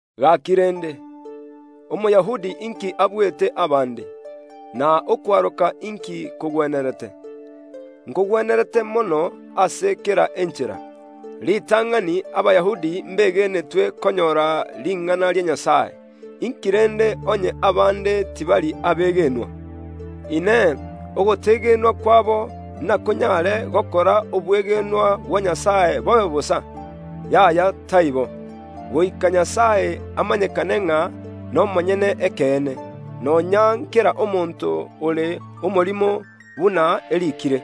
Gaki rende, Omoyahudi inki abuete abande? Na okwaroka inki kogwenerete? Nkogwenerete mono ase kera enchera. Ritang’ani, Abayahudi mbegenetwe konyora ring’ana ria Nyasae. Inki rende onye abande tibari abegenwa? Inee! Ogotegenwa kwabo nakonyaare gokora obwegenwa bwa Nyasae bobe bosa? Yaya, taibo! Goika Nyasae amanyekane ng’a nomonyene ekeene, nonya ’nkera omonto ore omorimo, buna eriikire,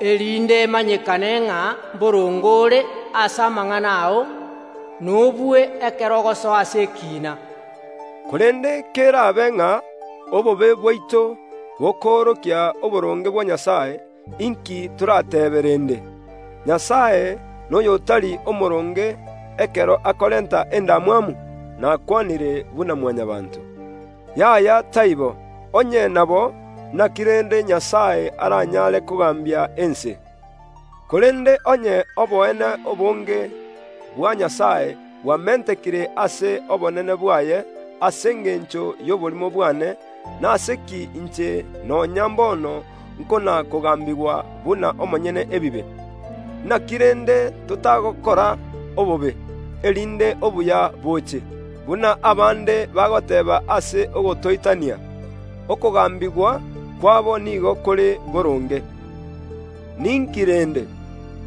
“Erinde omanyekane ng’a mboronge ore ase amang’ana ao, na obue ekero ogosoa ase ekiina.” Korende ker’abe ng’a obobe bwaito bokoorokia oboronge bwa Nyasae, inki torateebe rende? Nyasae noy’otari omooronge ekero akorenta endamwamu? (Nakwanire buna Mwanyabaanto). Yaya, taibo! Onye nabo, inaki rende Nyasae aranyare kogaambia ense? Korende onye oboene obonge bwa Nyasae bwamentekire ase obonene bwaye ase engencho y’oborimo bwane, nase ki inche nonya mbono nkona‐kogambigwa buna omonyene ebibe? Inaki rende totagokora obobe, erinde obuya boche? Buna abande bagoteeba ase ogotoitania. Okogambigwa kwabo nigo kore boronge. Ninki rende?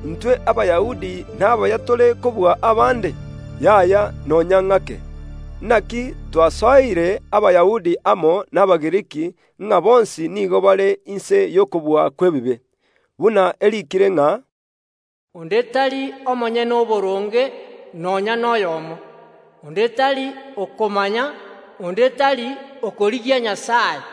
Intwe Abayahudi n’abaya tore kobua abande? Yaya, nonya ng’ake! Inaki nasoereire Abayahudi amo n’Abagiriki ng’a bonsi nigo bare inse y’okobua kw’ebibe; buna eriikire ng’a, “Onde tari omonyene oboronge, nonya noyomo; onde tari okomanya, onde tari okorigia Nyasae.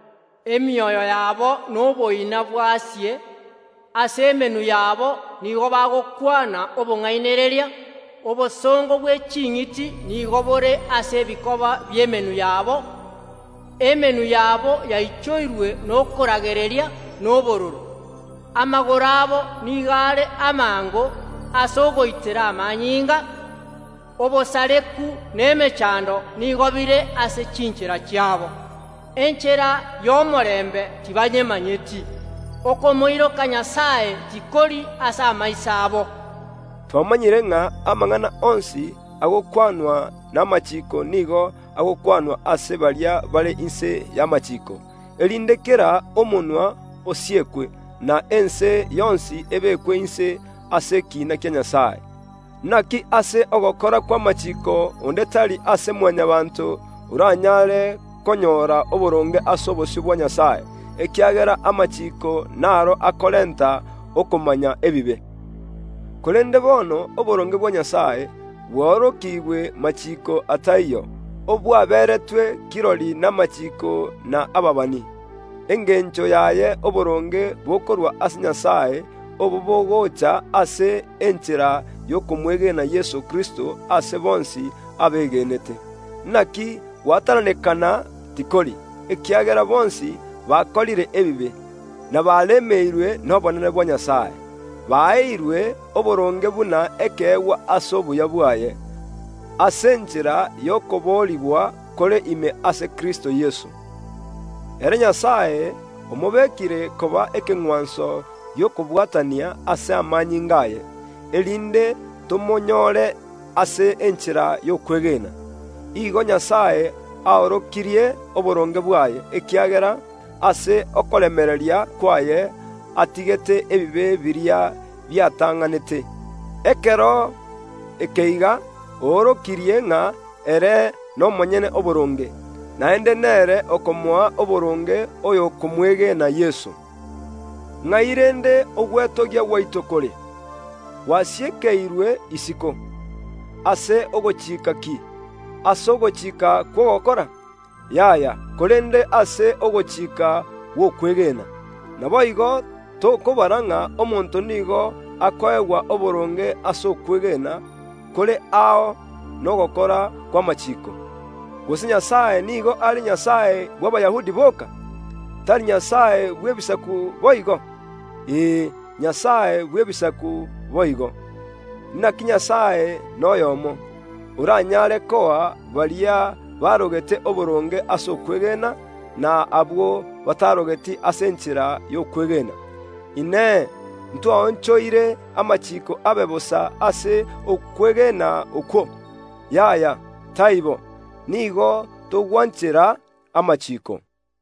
Emioyo yabo noboina bwasie, ase emenwa yabo nigo bagokwana obong’ainereria, obosongo bwe ching’iti nigo bore ase ebikoba bi’emenwa yabo. Emenwa yabo yaichoirwe nokoragereria na obororo, amagoro abo nigo are amaango ase ogoitera amanyinga, obosareku na emechando nigo bire ase chinchera chiabo. Enchera y’omorembe tibayemanyeti. Okomoiroka Nyasae tikori ase amaiso abo.” Twamanyire ng’a amang’ana onsi agokwanwa n’amachiiko nigo agokwanwa ase baria bare inse y’amachiiko, erinde kera omonwa osiekwe, na ense yonsi ebekwe inse ase ekiina kia Nyasae. Inaki ase ogokora kw’amachiiko onde tari ase Mwanyabaanto oranyare konyora oboronge ase obosio bwa Nyasae, ekiagera amachiiko n’aro akorenta okomanya ebibe. Korende bono oboronge bwa Nyasae bwaorokigwe machiiko ataiyo, obwaberetwe kirori namachiiko na ababani, engencho yaye oboronge bokorwa ase Nyasae obo bogocha ase enchera y’okomwegena Yeso Kristo ase bonsi abegenete. Inaki gwatananekana tikori, ekiagera bonsi bakorire ebibe, na baremeirwe n’obonene bwa Nyasae; baeirwe oboronge buna ekeegwa ase obuya bwaye, ase enchera y’okoboorigwa kore ime ase Kristo Yeso. Ere Nyasae omobekire koba ekeng’wanso gi’okobwatania ase amanyinga aye, erinde tomonyoore ase enchera y’okwegena. Igo Nyasae oorokirie oboronge bwaye, ekiagera ase okoremereria kwaye atigete ebibe biria biatang’anete. Ekero ekeiga oorokirie ng’a ere nomonyene oboronge, naende nere okomoa oboronge oyo okomwegena Yeso. Ng’ai rende ogwetogia gwaito kore? Kende tikeri. Ase ogochika ki? Ase ogochika kw’ogokora? Yaya, korende ase ogochika gw’okwegena. Naboigo, tokobara ng’a omonto nigo akoegwa oboronge ase okwegena kore ao nogokora kw’amachiiko. Gose Nyasae nigo are Nyasae bw’Abayahudi boka? Tari Nyasae bw’Ebisaku boigo? Ee, ere ’Nyasae bw’Ebisaku boigo. Inaki Nyasae noyomo, oranyare koa Abayahudi oboronge ase okwegena, na abanto b’ebisaku ase enchera y’okwegena. Inee! Ntwaonchoire amachiiko abe bosa ase okwegena okwo? Yaya, taibo! Nigo togwanchera amachiiko.